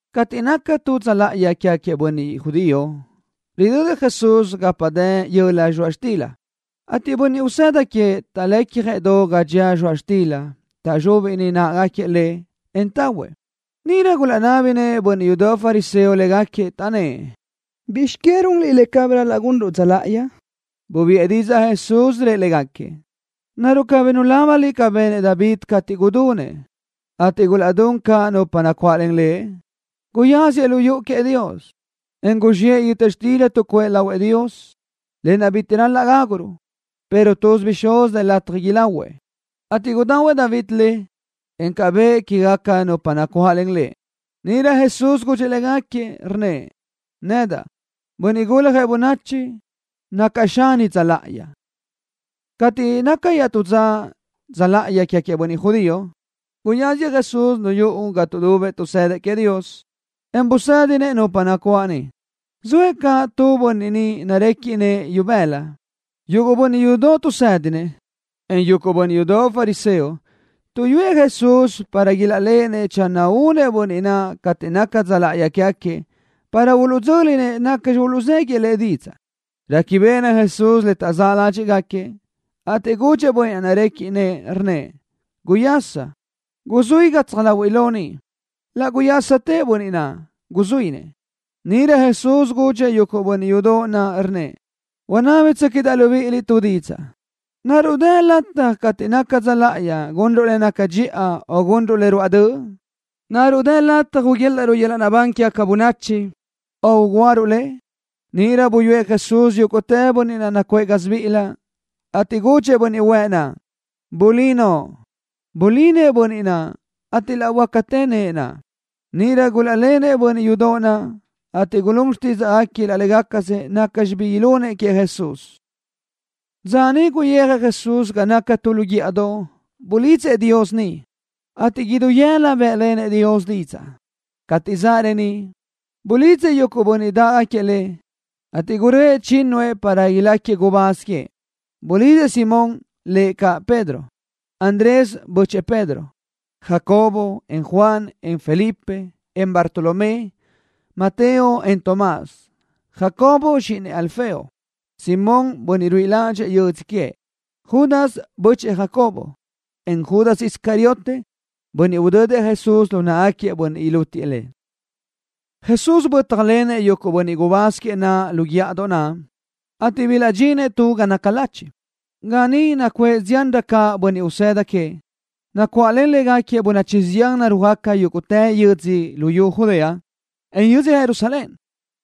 Cateʼ naca tu dza láʼayi quégaquiëʼ bönniʼ judío, ridödëʼ Jesús gapa dë yöla zxoaʼ xtila, ateʼ bönniʼ usëda queëʼ taʼlecjëʼ do ga dxía zxoaʼ xtila. Taʼzxúbiʼni náʼagaquiëʼ le, en tahuëʼ. Níʼirö gulaʼnábinëʼ bönniʼ yudoʼ fariseo légaquiëʼ, taʼnnë́ʼ: —¿Bizx que runliʼ le cabí ral-laʼ gunruʼ dza láʼayi? Bubiʼë didzaʼ Jesús, rëʼ légaquiëʼ: —¿Naruʼ cabí nulábaniliʼ ca benëʼ David cateʼ gudunëʼ, ateʼ gulaʼdún caʼ nupa nacuáʼlen lëʼ? Guyáziëʼ lu yuʼu queëʼ Dios, en guzxiʼë yöta xtila tuʼcuʼë lahuëʼ Dios, lë naʼ bitiʼ ral-laʼ gáguruʼ, pero tuz bixúz dë lataj ilahuëʼ, ateʼ gudahuëʼ David le, en bëʼë caʼ quéguequi nupa nacuáʼlen lëʼ. Níʼirö Jesús gudxëʼ légaquiëʼ, rnnëʼ: —Nedaʼ, Bönniʼ Guljëʼ Bönachi, nacaʼ xani dza láʼayi. Cateʼ naca iaʼtú dza láʼayi quégaquiëʼ bönniʼ judío, guyáziëʼ Jesús lu yuʼu ga tuʼdubëʼ tuʼsëdëʼ queëʼ Dios, en busédinëʼ nupa nacuáʼ niʼ. Zoëʼ caʼ tu bönniʼ niʼ narequiʼ nëʼë ibëla. Yuguʼ bönniʼ yudoʼ tuʼsédinëʼ, en yuguʼ bönniʼ yudoʼ fariseo tuʼyúëʼ Jesús para ilaʼléʼenëʼ channö únëʼ bönniʼ naʼ cateʼ naca dza láʼayi quégaquiëʼ para uluʼdzö́linëʼ nacxi uluʼzéguiëʼ Lëʼ didzaʼ. Réquibeʼenëʼ Jesús le taʼzáʼ ládxiʼgaquiëʼ, ateʼ gudxëʼ bönniʼ naʼ narequiʼ nëʼë, rnnëʼ: —Guyasa. Guzuí gatsaj láhuiʼlö ni. Laʼ guyásatëʼ bönniʼ naʼ, guzuínëʼ. Níʼirö Jesús gudxëʼ yuguʼ bönniʼ yudoʼ naʼ, rnnëʼ: —Unábitsöquiʼdaʼ libíʼiliʼ tu didzaʼ. ¿Naruʼ dë lataj cateʼ naca dza láʼayi gunruʼ le naca dxiʼa o gunruʼ le ruáʼ döʼ? ¿Naruʼ dë lataj uguélaʼruʼ yöl-laʼ naʼbán quégaca bönachi, o ugúaruʼ le? Níʼirö buyúëʼ Jesús yúguʼtë bönniʼ naʼ nacuʼë gásibiʼilëʼ, ateʼ gudxëʼ bönniʼ huëʼ naʼ: —Bulí noʼo. Bulí nëʼë bönniʼ naʼ, ateʼ laʼ böácatë nëʼë naʼ. Níʼirö gulaʼlenëʼ bönniʼ yudoʼ naʼ, ateʼ gulún xtídzaʼgaquiëʼ laʼ légacasëʼ nacxi bi ilunëʼ queëʼ Jesús. Dza niʼ guyijëʼ Jesús ga naca tu lu guíʼadoʼ. Bulidzëʼ Dios niʼ, ateʼ idú yëla bë́ʼlenëʼ Dios didzaʼ. Cateʼ zaʼ reníʼ, bulidzëʼ yuguʼ bönniʼ dáʼgaquiëʼ Lëʼ, ateʼ gurö́ëʼ chínnuëʼ para iláquiëʼ gubáz queëʼ. Bulidzëʼ: Simón, (lëʼ caʼ Pedro), Andrés, (bö́chëʼë Pedro), Jacobo, en Juan, en Felipe, en Bartolomé, Mateo, en Tomás, Jacobo, (zxíʼinëʼ Alfeo), Simón, (bönniʼ ruíʼi ládxëʼë yödzö queëʼ), Judas, (bö́chëʼë Jacobo), en Judas Iscariote, (bönniʼ udödëʼ Jesús lu náʼagaquiëʼ bönniʼ ilútiëʼ Lëʼ). Jesús bö́tjalenëʼ yuguʼ bönniʼ gubáz queëʼ naʼ lu guíʼadoʼ naʼ, ateʼ bilaʼdxinëʼ tu ga naca lachiʼ, ga niʼ nacuʼë ziánrö caʼ bönniʼ usëda queëʼ, ateʼ nacuáʼlen légaquiëʼ bönachi zián narúajgaca yúguʼtë yödzö luyú Judea, en yödzö Jerusalén,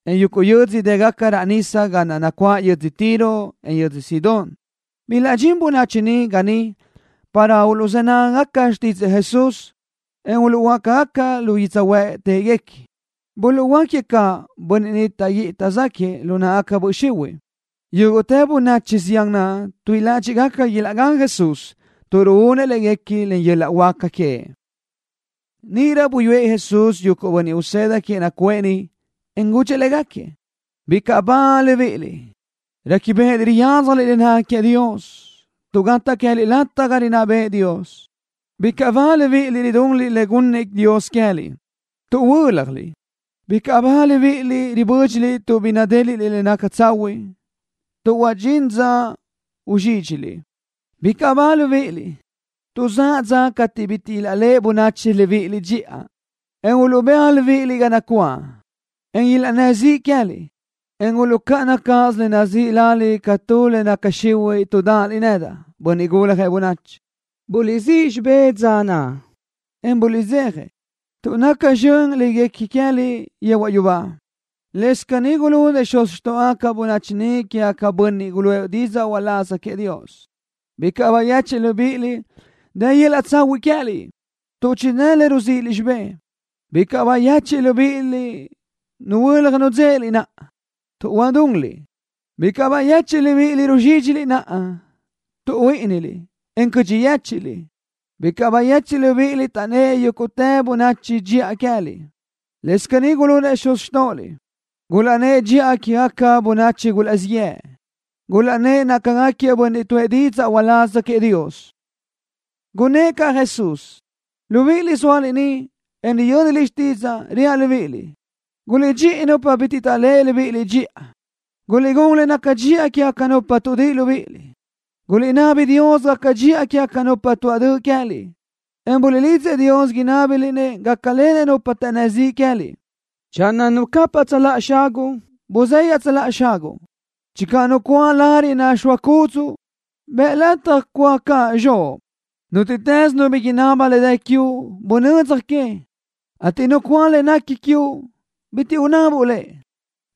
en yuguʼ yö́dzödoʼ dë́gaca raʼ nísadoʼ ga naʼ nacuáʼ yödzö Tiro, en yödzö Sidón. Bilaʼdxín bönachi ni ga niʼ para uluʼzë́ nágagaca xtídzëʼë Jesús, en uluʼhuöáca lu yödzöhuë́ʼ téʼeguequi. Buluʼhuöáquiëʼ caʼ bönniʼ niʼ taʼguíʼi taʼzáquiëʼ lu náʼagaca böʼ xihuiʼ. Yúguʼtë bönachi zián naʼ tuíʼi ládxiʼgaca ilaʼgán Jesús tuʼ ruúnëʼ léguequi len yöl-laʼ huáca queëʼ. Níʼirö buyúëʼ Jesús yuguʼ bönniʼ usëda queëʼ nacuʼë niʼ, en gudxëʼ légaquiëʼ: —Bicaʼ ba libíʼiliʼ, réquibeʼeliʼ riyadzjaliʼ le naca queëʼ Dios, tuʼ gataʼ queë́liʼ lataj ga rinná bëʼë Dios. ’Bicaʼ ba libíʼiliʼ ridunliʼ le gunnëʼ Dios queë́liʼ, tuʼ huö́ljaliʼ. ’Bicaʼ ba libíʼiliʼ ribö́dxiliʼ tuʼ bi nadéliʼliʼ le naca tsahuiʼ, tuʼ huadxín dza uzxídxiliʼ. ’Bicaʼ ba libíʼiliʼ, tuʼ zaʼ dza cateʼ bitiʼ ilaʼléʼe bönachi libíʼiliʼ dxiʼa, en uluʼbéaj libíʼiliʼ ga nacuáʼ, en ilaʼnnë́ ziʼ queë́liʼ, en uluʼcáʼana cáʼasö le nazíʼi laliʼ ca tu le naca xihuiʼ tuʼ dáʼaliʼ nedaʼ, Bönniʼ Guljëʼ Bönachi. Buliʼsíʼ xibé dza naʼ, en buliʼdzeja, tuʼ naca zxön le guequi queë́liʼ yehuaʼ yubá. Lëscaʼ caní gulunëʼ xuz xtóʼogaca bönachi ni quégaquiëʼ bönniʼ guluʼë didzaʼ uláz queëʼ Dios. ’Bicaʼ bayechiʼ libíʼiliʼ, dë yöl-laʼ tsahuiʼ queë́liʼ, tuʼ chidë́ le ruzíʼiliʼ xibé. ’Bicaʼ bayechiʼ libíʼiliʼ nuhuö́laj nudzéʼeliʼ naʼa, tuʼ huadunliʼ. ’Bicaʼ bayechiʼ libíʼiliʼ ruzxídxili naʼa, tuʼ huíʼiniliʼ, en cödxi yéchiʼliʼ. ’Bicaʼ bayechiʼ libíʼiliʼ taʼnnë́ yúguʼtë bönachi dxiʼa queë́liʼ. Lëscaʼ caní gulunëʼ xuz xtóʼoliʼ, gulaʼnnë́ʼ dxiʼa quégaquiëʼ bönniʼ gulaʼzíʼ yëʼë, gulaʼnnë́ʼ nácagaquiëʼ bönniʼ tuʼë didzaʼ uláz queëʼ Dios. Gunnë́ʼ caʼ Jesús: —Libiʼiliʼ zóaliʼ ni, en riyö́niliʼ xtídzaʼa, reaʼ libíʼiliʼ: Guliʼdxíʼi nupa bitiʼ taʼléʼe libíʼiliʼ dxiʼa. Guliʼgún le naca dxiʼa quégaca nupa tuʼdíʼi libíʼiliʼ. Guliʼnabi Dios gaca dxiʼa quégaca nupa tuaʼ döʼ queë́liʼ, en buliʼlidzëʼ Dios inábiliʼ-nëʼ gácalenëʼ nupa taʼnnë́ ziʼ queë́liʼ. Channö nu capaʼ tsöláʼa xaguʼ, buzë́ iaʼtsöláʼa caʼ xaguʼ. Channö nu cúa lariʼ naxóa cúdzuʼu, bëʼ lataj cúa caʼ zxoʼ. Nútiʼtës nu bi inaba le dë quiuʼ, bunödzaj que, ateʼ nu cúa le nequi quiuʼ, bitiʼ unabuʼ le.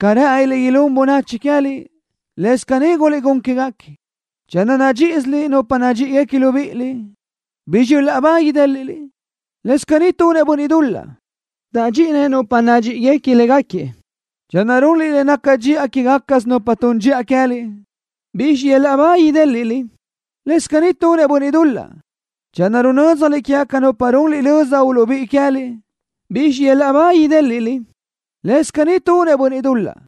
Ca rë́ʼëniliʼ ilún bönachi queë́liʼ, lëscaʼ caní guliʼgún quéguequi. ’Channö nadxíʼisiliʼ nupa nadxíʼigaca libíʼiliʼ, ¿bizxi yöl-laʼ ba idéliʼliʼ? Lëscaʼ caní tunëʼ bönniʼ dul-laʼ, taʼdxíʼinëʼ nupa nadxíʼiguequi légaquiëʼ. Channö runliʼ le naca dxiʼa quégacasö nupa tun dxiʼa queë́liʼ, ¿bizxi yöl-laʼ ba idéliʼliʼ? Lëscaʼ caní tunëʼ bönniʼ dul-laʼ. Channö runö́dzjaliʼ quégaca nupa runliʼ löza uluʼbíʼi queë́liʼ, ¿bizxi yöl-laʼ ba idéliʼliʼ? Lëscaʼ caní tunëʼ bönniʼ dul-laʼ,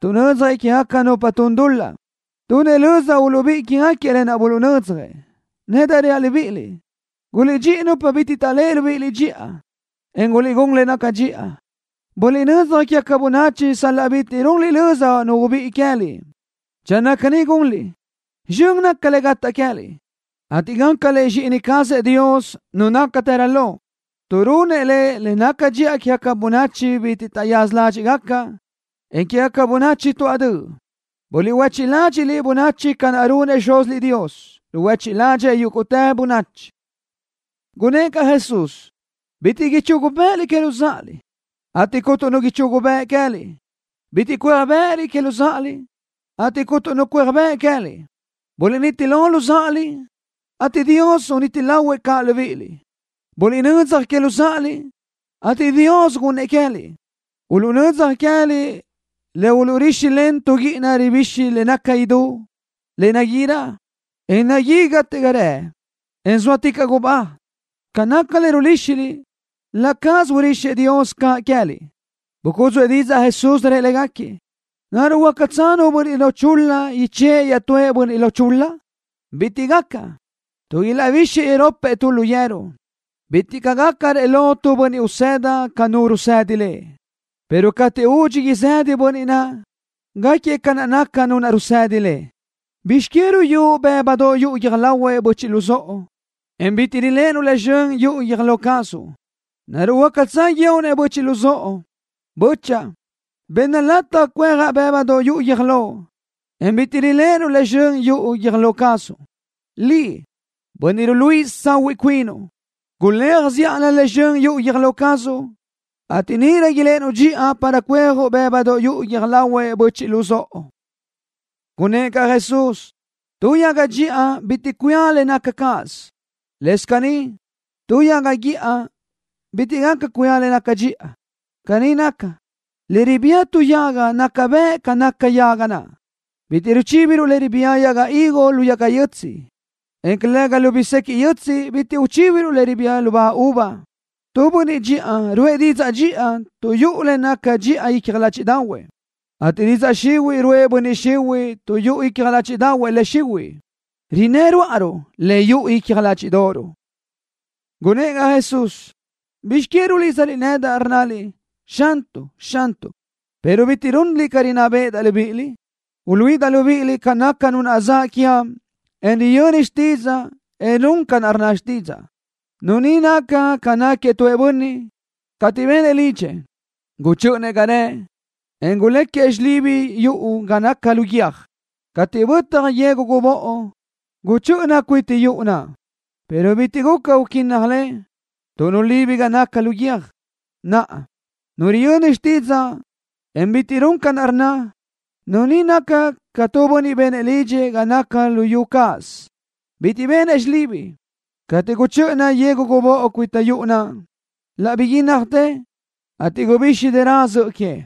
tuʼnödzjëʼ quégaca nupa tun dul-laʼ, tuʼ tunëʼ löza uluʼbíʼi quégaquiëʼ lë naʼ buluʼnödzjëʼ. Nedaʼ reaʼ libíʼiliʼ: Guliʼdxíʼi nupa bitiʼ taʼléʼe libíʼiliʼ dxiʼa, en guliʼgún le naca dxiʼa. Buliʼnödzaj quégaca bönachi sal-laʼ bitiʼ runliʼ löza nu ubíʼi queë́liʼ. Channö caní gunliʼ, zxön naca le gataʼ queë́liʼ, ateʼ gácaliʼ zxíʼini cazëʼ Dios, Nu nácatërö lo, tuʼ runëʼ Lëʼ le naca dxiʼa quégaca bönachi bitiʼ taʼyaza ládxiʼgaca, en quégaca bönachi tuáʼ döʼ. Buliʼhuéchiʼ ládxiʼliʼ bönachi ca naʼ runëʼ Xúziliʼ Dios, ruhuéchiʼ ládxëʼë yúguʼtë bönachi. Gunnë́ʼ caʼ Jesús: —Bitiʼ ichugu bë́ʼëliʼ que luzáʼaliʼ, ateʼ cuntu nu ichugu bëʼ queë́liʼ. Bitiʼ cuéaj bë́ʼëliʼ que luzáʼaliʼ, ateʼ cuntu nu cuéaj bëʼ queë́liʼ. Buliʼniti lo luzáʼaliʼ, ateʼ Dios uniti lahuëʼ caʼ libíʼiliʼ. Buliʼnödzaj que luzáʼaliʼ, ateʼ Dios gunnëʼ queë́liʼ. Uluʼnödzjëʼ queë́liʼ le uluʼrixëʼ len tu guíʼina ribixi le naca idú, le naguirö, en naguí gate ga rëʼ, en zóaticaʼ gubá. Ca naca le ruríxiliʼ, laʼ cáʼasö urixëʼ Dios caʼ queë́liʼ. Bucúdzuʼë didzaʼ Jesús, rëʼ légaquiëʼ: —¿Naruʼ huácatsö nu bönniʼ lo chul-la ichë́ʼë iaʼtúëʼ bönniʼ lo chul-la? Bitiʼ caʼ gaca, tuʼ ilaʼbixëʼ iropëʼ tu lu yeru. Bitiʼ caʼ gácarëʼ lo tu bönniʼ usëda ca nu rusëdi lëʼ, pero cateʼ údxi izëdëʼ bönniʼ naʼ, gáquiëʼ ca naca nu naʼ rusëdi lëʼ. ’¿Bizx que ruyúʼ bë́budoʼ yuʼu guiö́j lahuëʼ böchiʼ luzóʼo, en bitiʼ riléʼenuʼ le zxön yuʼu guiö́j lo cazuʼ? ¿Naruʼ huácatsö guíoʼ-nëʼ böchiʼ luzóʼo: “Bö́chaʼa, benna lataj cuejaʼ bë́budoʼ yuʼu guiö́j loʼ”, en bitiʼ riléʼenuʼ le zxön yuʼu guiö́j lo cazuʼ? Liʼ, bönniʼ ruluíʼisö tsahuiʼ cuinuʼ, guléaj zíʼalö le zxön yuʼu guiö́j lo cazuʼ, ateʼ níʼirö iléʼenuʼ dxiʼa para cuejuʼ bë́budoʼ yuʼu guiö́j lahuëʼ böchiʼ luzóʼo. Gunnë́ʼ caʼ Jesús: —Tu yaga dxiʼa bitiʼ cuía le naca cáʼasö. Lëscaʼ caní, tu yaga guíʼa bitiʼ gaca cuía le naca dxiʼa. Caní naca, le ribía tu yaga naca bëʼ ca naca yaga naʼ. Bitiʼ ruchíbiruʼ le ribía yaga higo lu yaga yötsiʼ, en calëga lu bisequiʼ yötsiʼ bitiʼ ruchíbiruʼ le ribía lubá uva. Tu bönniʼ dxiʼa ruʼë didzaʼ dxiʼa tuʼ yuʼu le naca dxiʼa icja ládxiʼdaʼahuëʼ, ateʼ didzaʼ xihuiʼ ruʼë bönniʼ xihuiʼ tuʼ yuʼu icja ládxiʼdaʼahuëʼ le xihuiʼ. Rinnë́ ruáʼaruʼ ca naca le yuʼu icja ládxiʼdoʼoruʼ. Gunnë́ʼ caʼ Jesús: —¿Bizx que rulídzaliʼ nedaʼ, rnnaliʼ: “Xantuʼ, Xantuʼ”, pero bitiʼ runliʼ ca rinná béʼedaʼ libíʼiliʼ? Uluíʼidaʼ libíʼiliʼ ca naca nu naʼ zaʼ quiaʼ, en riyöni xtídzaʼa, en run ca rnna xtídzaʼa. Nu ni naca ca tu bönniʼ, cateʼ benëʼ lidxëʼ, guchö́ʼönëʼ ga rëʼ, en guléquiëʼ xilibi yuʼu ga naca lu guiö́j. Cateʼ bötaj yegu gubóʼo, guchö́ʼöna cuita yuʼu naʼ, pero bitiʼ guca uquínnaj le, tuʼ nulibi ga naca lu guiö́j. Naʼa, nu riyöni xtídzaʼa, en bitiʼ run ca rnna, nu ni naca ca tu bönniʼ benëʼ lidxëʼ ga naca lu yu cáʼasö. Bitiʼ benëʼ xilibi. Cateʼ guchö́ʼöna yegu gubóʼo cuita yuʼu naʼ, laʼ biguínnajtë, ateʼ gubixi dërö zöʼö que.